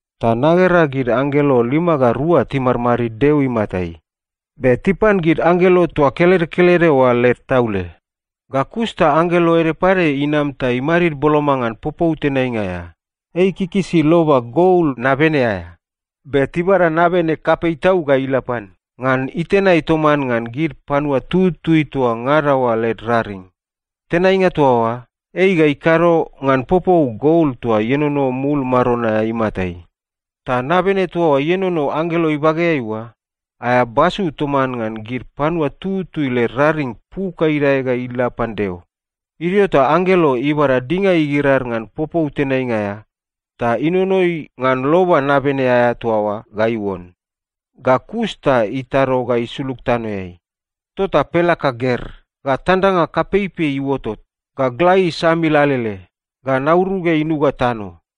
Ta nagera gid anggelo lima ga rua timadmadid Deo imatai. Be tipan gid anggelo toa kelede kelede oa led taule. Ga kus ta anggelo ede pade inam ta imadid boloma ngan popou tenainga aea. Ei ikikisi loba gol nabene aea, be tibada nabene kapei tau ga ila pan, ngan itenai toman ngan gid panua tututui toa ngada oa led raring. Tenainga toa oa, ei ga ikado ngan popou gol toa ienono mul maron aea imatai. Ta nabene toa ienono anggelo ibageai oa, aea basu toman ngan gid panua tututui led raring puk ga idae ga ila pan Deo. Idio ta anggelo ibada dinga igirar ngan popou tenainga aea, ta inonoi ngan loba nabene aea toa oa ga iuon. Ga kus ta itado ga isulug tanoeai. Tota pelaka ger, ga tandanga kapeipei iuotot, ga gla isamil alele, ga nauruge inuga tano.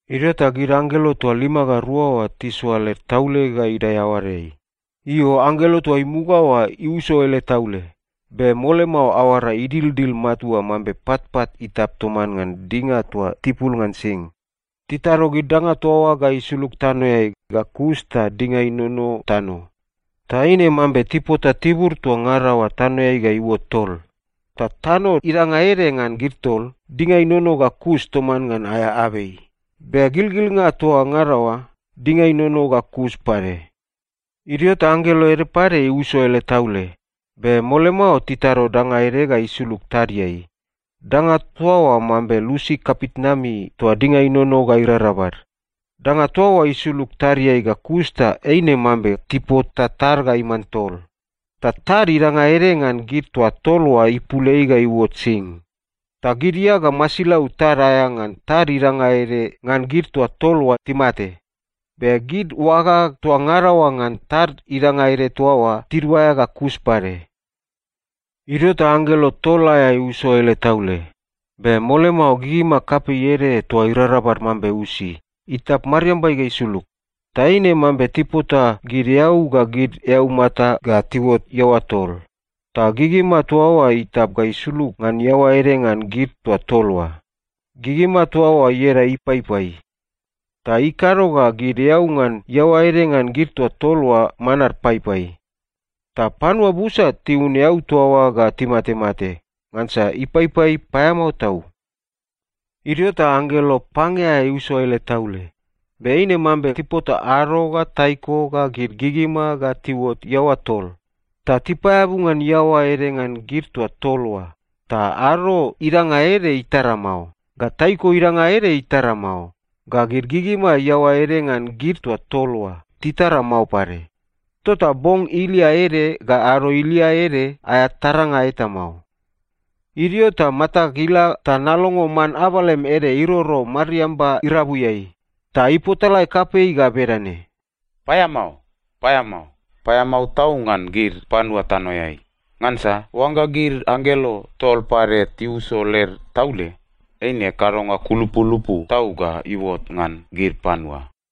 Idio ta gid anggelo toa lima ga rua oa tisoa led taule ga idae aoadeai. Io, anggelo toa imuga oa iuso ele taule. Be mole mao aoara idildil matua mambe patpat itap toman ngan dinga toa tibul ngan sing. Titado gid danga toa oa ga isulug tanoeai, ga kus ta dinga inono tano. Ta eine mambe tipota tibur toa ngada oa tanoeai ga iuot tol. Ta tano idanga ede ngan gid tol, dinga inono ga kus toman ngan aea abei. Be gilgilnga toa ngada oa, dinga inono ga kus pade. Idio ta anggelo ede pade iuso ele taule. Be mole mao titado danga ede ga isulug tadiai. Danga toa oa mambe lusi kapitnami toa dinga inono ga irarabal. Danga toa oa isulug tadiai ga kus ta eine mambe tipota tad ga iman tol. Ta tad idanga ede ngan gid toa tol oa ipul ei ga iuot sing. Ta gid ia ga masilau tad aea ngan tad idanga ede ngan gid toa tol oa timate. Be gid oaga toa ngada oa ngan tad idanga ede toa oa tiduaea ga kus pade. Idio ta anggelo tol aea iuso ele taule. Be mole mao gigima kapei ede toa irarabal mambe usi, itap mariambai ga isulug. Ta eine mambe tipota gid eau ga gid eaumata ga tiuot iaoa tol. Ta gigima toa oa itap ga isulug ngan iaoa ede ngan gid toa tol oa. Gigima toa oa ieda Ipaipai. Ta ikado ga gid eau ngan iaoa ede ngan gid toa tol oa manad paipai. Ta panua busa tiun eau toa oa ga timatemate, ngansa ipaipai paeamao tau. Idio ta anggelo pange aea iuso ele taule. Be eine mambe tipota ado ga taiko ga gid gigima ga tiuot iaoa tol. Ta tipaeabu ngan iaoa ede ngan gid toa tol oa, ta ado idanga ede itara mao, ga taiko idanga ede itara mao, ga gid gigima iaoa ede ngan gid toa tol oa titara mao pade. Tota bong ilia ede ga ado ilia ede aea taranga eta mao. Idio ta matag ila ta nalongo man abalem ede iroro mariamba irabuiai. Ta ipotalae kapei ga bedane, “Paeamao, paeamao, paeamao tau ngan gid panua tanoeai! Ngansa oangga gid anggelo tol pade tiuso led taule, eine kadonga kulupulupu tau ga iuot ngan gid panua.”